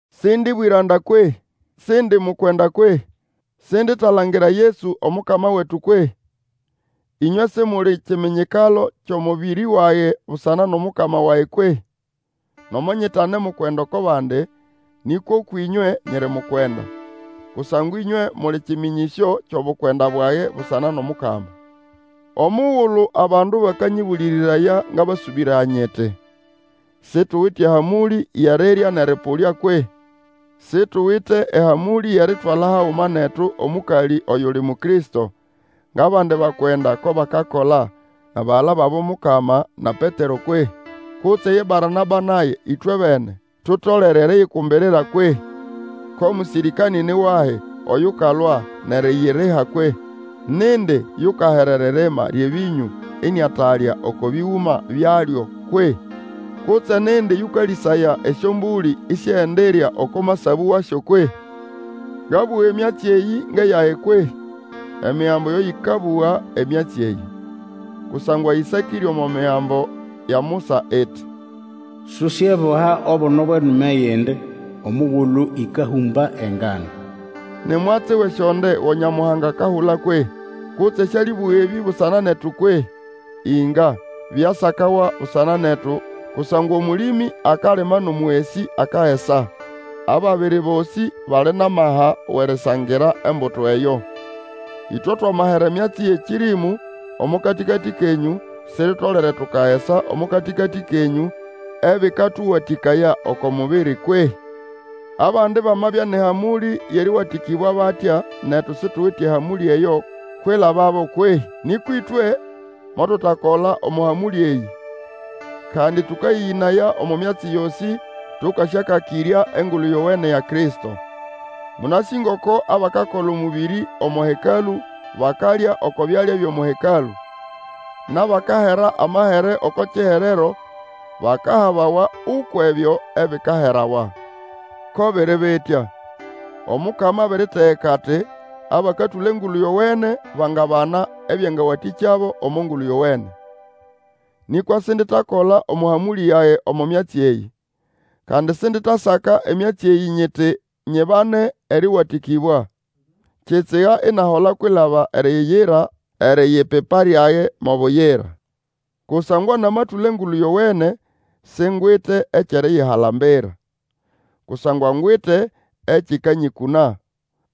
Sindi bwĩranda kwehĩ? Sindi mukwenda kwehĩ? Sinditalangira Yesu Omukama wetu kwehĩ? Ĩnywe Simuli kiminyikalo kyʼomũbĩrĩ wage busana nʼomukama wage kwehĩ? Nomo nyitane mukwenda oko bandi, nĩkwa ũkwʼĩnywe nyiri mukwenda; kusangwa ĩnywe muli kĩmĩnyĩsyo kyʼobukwenda bwage busana nʼomukama. Omugulu abandu bakanyĩbũlĩrĩraya, ngabasũbĩraya nyiti, Situwite ehamũlĩ yʼerirya nʼerĩpũlya kwehĩ? Situwite ehamũlĩ yʼeritwala haguma netu omũkalĩ oyuli Mukristo, ngʼabandi bakwenda ko bakakola, nʼabagala babo Mukama, na Petero kwehĩ? Kutse ye Barnaba nage, ĩtwebene, tutolere eriyikumbirira kwehĩ? Ko mũsĩrĩkanĩ ni wahi oyukayalwa nʼeriyiriha kwehĩ? Nindi yukahera eririma lyʼebĩnyũ iniatalya oko bĩgũma byalyo kwehĩ? Kutse nindi yũkalĩsaya esyombũlĩ isiendirya oko masabũ wasyo kwehĩ? Ngabũga emyatsi eyĩ ngʼeyage kwehĩ? Emigambo yo yʼĩkabũga emyatsi eyĩ. Kusangwa ĩsakĩre omo migambo ya Musa iti, Susyeboha obuno bwʼenume yʼende omugulu ĩkahũmba engano. Ni mwatsi wʼesyonde go Nyamuhanga akahula kwehĩ? Kutse sĩalĩbũga ebĩ busana netu kwehĩ? Inga, byasakawa busana netu, kusangwa Omũlĩmĩ akalima nʼomũgesĩ akagesa, ababiri bosĩ bali nʼamaha wʼerisangira embuto eyo. Ĩtwe twamahera emyatsi yʼekĩrĩmũ omo katĩkatĩ kenyũ, siritolere tukagesa omo katĩkatĩ kenyũ ebĩkatũwatĩkaya oko mubiri kwehĩ? Abandi bamabya nʼehamũlĩ yʼerĩwatĩkĩbwa batya, netu situwite ehamũlĩ eyo kwilababo kwehĩ? Nĩkwa ĩtwe motutakola omo hamũlĩ eyĩ, kandi tũkayĩyĩnaya omo myatsi yosĩ, tũkasyakakĩrya Engulu Yowene ya Kristo. Mũnasĩ ngoko abakakola omũbĩrĩ omo hekalũ bakalya oko byalya byʼomo hekalũ, nʼabakahera amahere oko kiherero bakahabawa ukwʼebyo ebikaherawa. Ko biri bitya. Omukama abiritegeka ati, Abakatũla Engulu Yowene bangabana ebyangawatĩkyabo omo Ngulu Yowene. Nĩkwa sinditakola omo hamũlĩ yage omo myatsi eyĩ. Kandi sinditasaka emyatsi eyĩ nyiti nyibane erĩwatĩkĩbwa. Kitsiga inahola kwilaba eriyira eriyipipa lyage mo buyira. Kusangwa namatũla Engulu Yowene, singwite ekyʼeriyihalambira. Kusangwa ngwite ekĩkanyĩkũna.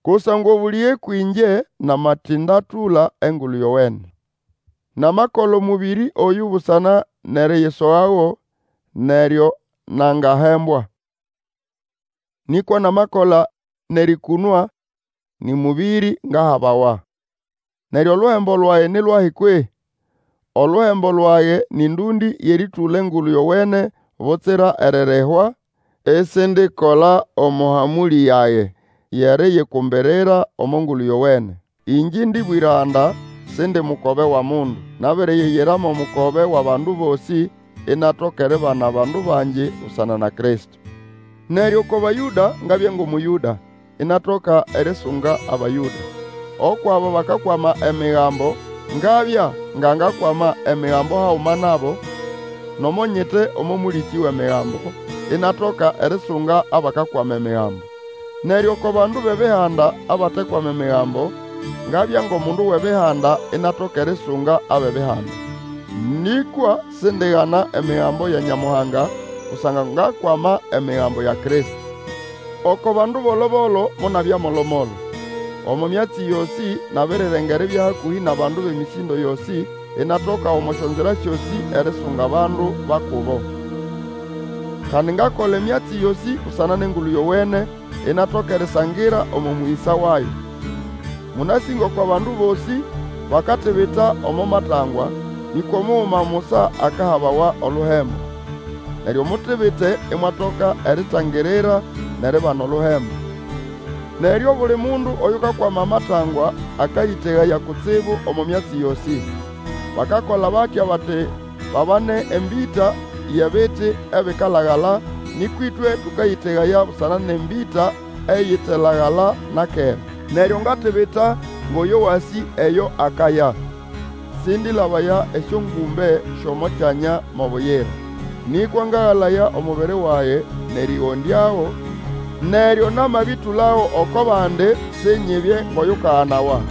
Kusangwa obũlĩge kwĩngye namatindatũla Engulu Yowene. Namakola omũbĩrĩ oyũ busana nʼeriyisogago neryo nangahembwa; nĩkwa namakola nʼerĩkũnwa, nĩ mũbĩrĩ ngahabawa. Neryo oluhembo lwage ni lwahi kwehĩ? Oluhembo lwage nĩ ndũndĩ yʼerĩtũla Engulu Yowene butsira eririhwa, isindikola omo hamũlĩ yage yʼesriyikumbirira omo Ngulu Yowene. Ingye indi bwĩranda, Sindi mukobe wʼomundu; nabiriyiyira mo mukobe wʼabandu bosĩ, inatoka eribana abandu bangi busana na Kristo. Neryo oko Bayũda ngabya ngʼOmũyũda, inatoka erisunga Abayũda. Ukwʼabo bakakwama Emigambo ngabya nga ngakwama Emigambo haguma nabo, nomo nyite omo mũlĩkĩ wʼEmigambo, inatoka erisunga abakakwama Emigambo. Neryo oko bandu bʼEbihanda abatekwama Emigambo, ngabya ngʼomundu wʼEbihanda inatoka erisunga abʼEbihanda. Nĩkwa sindigana Emigambo ya Nyamuhanga, kusangwa ngakwama Emigambo ya Kristo. Oko bandu bolo-bolo, monabya molomolo. Omo myatsi yosĩ, nabirirenga eribya hakũhĩ nʼabandu bʼemĩsĩndo yosĩ, inatoka omo syonzira syosĩ erisunga abandu ba kubo. Kandi ngakola emyatsi yosĩ busana nʼEngulu Yowene, inatoka erisangira omo mũyĩsa wayo. Mũnasĩ ngoko abandu bosĩ bakatibita omo matangwa, nĩkwa omuguma musa akahabawa oluhembo. Neryo mutibite imwatoka eritangirira, nʼeribana oluhembo. Neryo obuli mundu oyukakwama amatangwa, akayĩtegaya kutsibu omo myatsi yosĩ. Bakakola batya bati babane embĩta yʼebiti ebikalagala, nĩkwa ĩtwe tũkayĩtegaya busana nʼembĩta eyitelagala na kera. Neryo ngatibita ngʼoyo wasĩ eyo akaya; sĩndĩlabaya esyongũmbe syʼomo kyanya mo buyira. Nĩkwa ngagalaya omubiri wage, nʼerĩgondyago, neryo namabĩtũlago oko bandi, sinyibye ngʼoyukaganawa.